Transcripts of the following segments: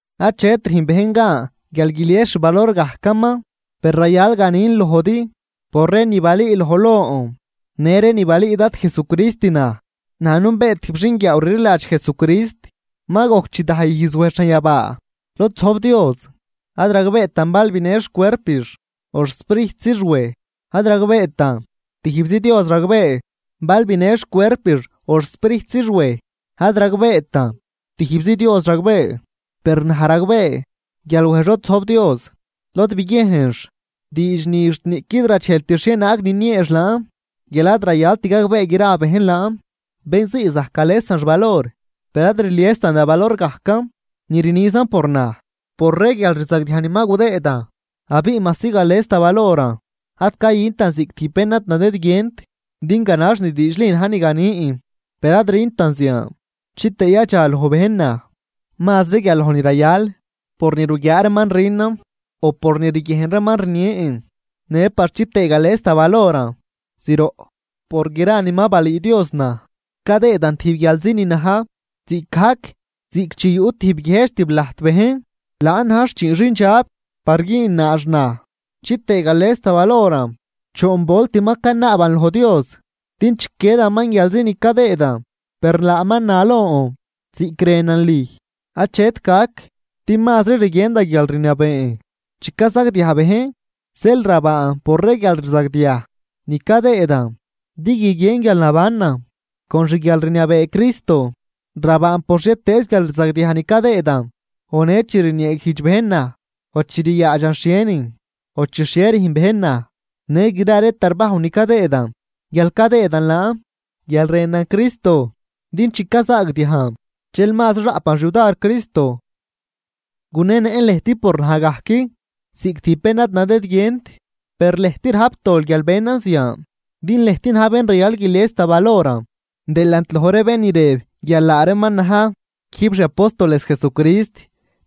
Achet rüjn bejn gan guial guilies xvalor gajcaman, per rayal ganin lojdi por ree ni balüüloj lon në ree ni balüü Dad Jesucrist naj. Naj nünbee tijb xinguiaaw rliladx Jesucrist, ma gojc chidaj ijz wejx xanyabaa lod zojb Dios. Ad ragbeetan bal binë xcuerpix o xsprijtzix wej, ad ragbeetan, tijbzi Dios ragbee. Bal binë xcuerpix o xsprijtzix wej, ad ragbeetan, tijbzi Dios ragbee. Per naj ragbee guial wejx lod zojb Dios, lod biguiejnx diidx ni xt niꞌquid radxejlt xhienaag ninieex laan guial ad rayalt gagbee gra bejn laan. Bén zii zajc galesan xvalor, per ad rliestan da valor gajcan, ni rnizan por naj por ree guialrzagdiaj ni ma gudëëdan. Abiꞌ majsi gales da valoran, ad cayüntan ziꞌc tijb bén ad nadëdguient din ganax ni diidxli na̱j ni ganin. Per ad rüntan zian chitëë yadxaloj bejn naj mazri guial loj ni rayal por ni ruguiaa reeman rünan, o por ni riguiejn reeman rnien. Në par chitëë gales da valoran zroꞌ por gra ni ma balüü Dios naj, cadëëdan tijb guialzi ni na̱j ziꞌcgajc ziꞌc chi yuꞌ tijb guiëjch tiblajt bejn. Laan na̱j xchiin xindxab par güünnaax naj chitëë gales da valoran. Choon volt ma canaaban loj Dios din chiquiedaman guialzi ni cadëëdan, per laaman na lon: “Ziꞌc rënan lüj achet gac, din mazri rguien da guialrniabeen chi cazagdiaj bejn.” Zeel rabaan por ree guialrzagdiaj ni cadëëdan din guiguien guial nabanan con xguialrniabee Cristo. Rabaan por xhietëëz guialrzagdiaj ni cadëëdan, o në chi rnieeguijdx bejn naj, o chi ryaadxan xhienin, o chi xhie rüjn bejn naj, në gra ree tarbajw ni cadëëdan, guial cadëëdan laan guial rënan Cristo. Din chi cazaagdiajn dxel mazri raꞌpan xyudar Cristo. Gunenëꞌn lëjt por naj gajc ziꞌc tijb bén ad nadëdguient, per lëjt rajp dol guial benan zian. Din lëjt na̱j bén rayal guilies da valoran delant loj ree bén ni rëb guial laa reeman na̱j quijb xi apóstoles Jesucrist.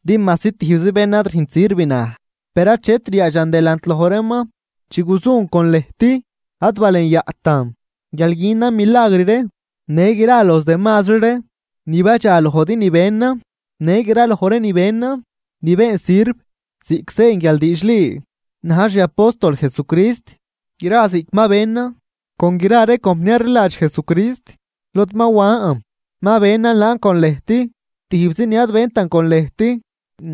Din majsi tijbzi bén ad rüjnt sirv naj, per achet ryaadxan delant loj reeman. Chi guzun con lëjt ad balenyaꞌtan guial günan milagr ree në gra los demazri ree ni badxalojdi ni benan në graloj ree ni benan ni been sirv ziꞌc sen guial diidxli najn xi apóstol Jesucrist. Gra ziꞌc ma benan con gra ree compniar rliladx Jesucrist lod ma wan, ma benan laan con lëjt. Tijbzi ni ad bentan con lëjt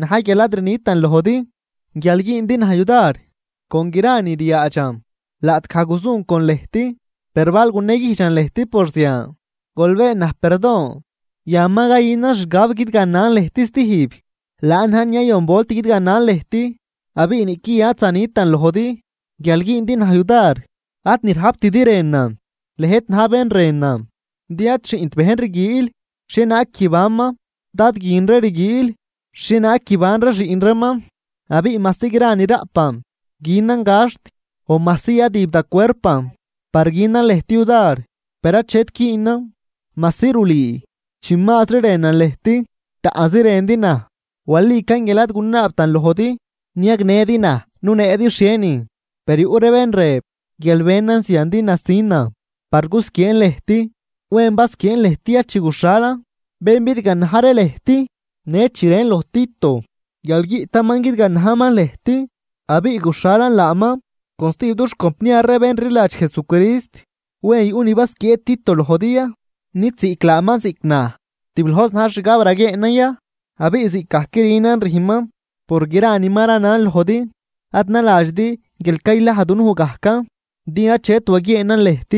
na̱j guial ad rnitan lojdi guial güündi naj yudar con gra ni ryaadxan laꞌtgaj guzun con lëjt, per bal guneguijdxan lëjt por zian ¡Gol been naj perdon! Yan ma cayünan xgab guidganan lëjt stijb, laan na̱j ni yayon volt guidganan lëjt. Abiꞌ niꞌqui yan ad zanitan lojdi guial güündi naj yudar, ad ni rajptidi rënan, lëjt na̱j bén rënan. Din ad xiꞌnt bejn rguiil xhienaag guibanman, dad guin ree rguiil xhienaag guiban ree xiꞌn reeman. Abiꞌ majsi gra ni raꞌpan günan gaxt, o majsi yadib da cuerpan par günan lëjt yudar, per achet güünan. Majsi rulüü chi mazri rënan lëjt, taꞌnzi rëndi na̱j. Walican guial ad gunaabtan lojdi niagnëdi naj nuneedi xhienin, per yuꞌ ree bén rëb guial benan zian din nasinan par gusquien lëjt. ¿Wen basquieen lëjt ya chi guxhalan bén bidganaj ree lëjt? Në chi rën loj Tito guial guiꞌtaman guidganajman lëjt abiꞌ guxhalan laaman con stijb dux compniar ree bén rliladx Jesucrist, ¿wen yuꞌ ni basquiee Tito lojdi ya? ¿Nid ziꞌc laaman ziꞌc naj tiblojzi na̱j xgab raguieenan ya abiꞌ ziꞌcgajc rünan rüjnman? Por gra ni ma ranan lojdi, ad naladxidi guial caylaj dunuj gajcan, din achet waguieenan lëjt.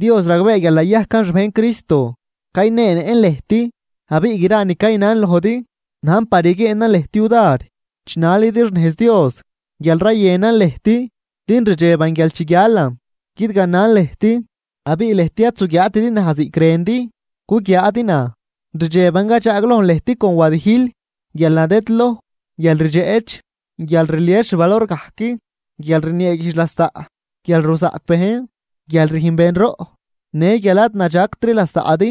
Dios ragbee guial ziꞌc nayajcan xbejn Cristo cayneenëꞌn lëjt, abiꞌ gra ni caynan lojdi najn par yaguieenan lëjt yudar chinalidi xnejz Dios guial rayënan lëjt. Din rdxeban guial chi guialan guidganan lëjt ad zadxaaglojtan lëjt ziꞌc rënan, abiꞌ lëjt ad zuguiaatidi naj ziꞌc rëndi guguiaadi naj. Rdxeban gadxaaglojn lëjt con wadijl, guialnadëdloj, guialrdxeꞌch, guialrlies xvalor gajc, guialrniee guijdx lasaꞌ, guial ruzaꞌt bejn, guial rüjn benroꞌ në guial ad nadxagtri lasaꞌdi.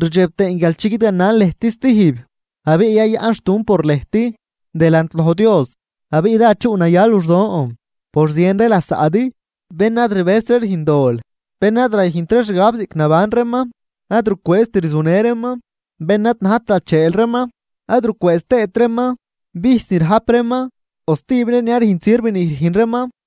Rdxeb tëën guial chi guidganan lëjt stijb abiꞌ yayaꞌnxtun por lëjt delant loj Dios. Abiꞌ dád chuꞌ naya luxdon por zien ree lasaꞌdi bén ad rbëzt ree rüjn dol, bén ad rayüjnt ree xgab ziꞌc naban reeman. Ad rucwëëzt rzunë reeman bén ad najt lacheel reeman, ad rucwëëz tëët reeman vijs ni rajp reeman o stijb ree ni ad rüjnt sirv ni rüjn reeman.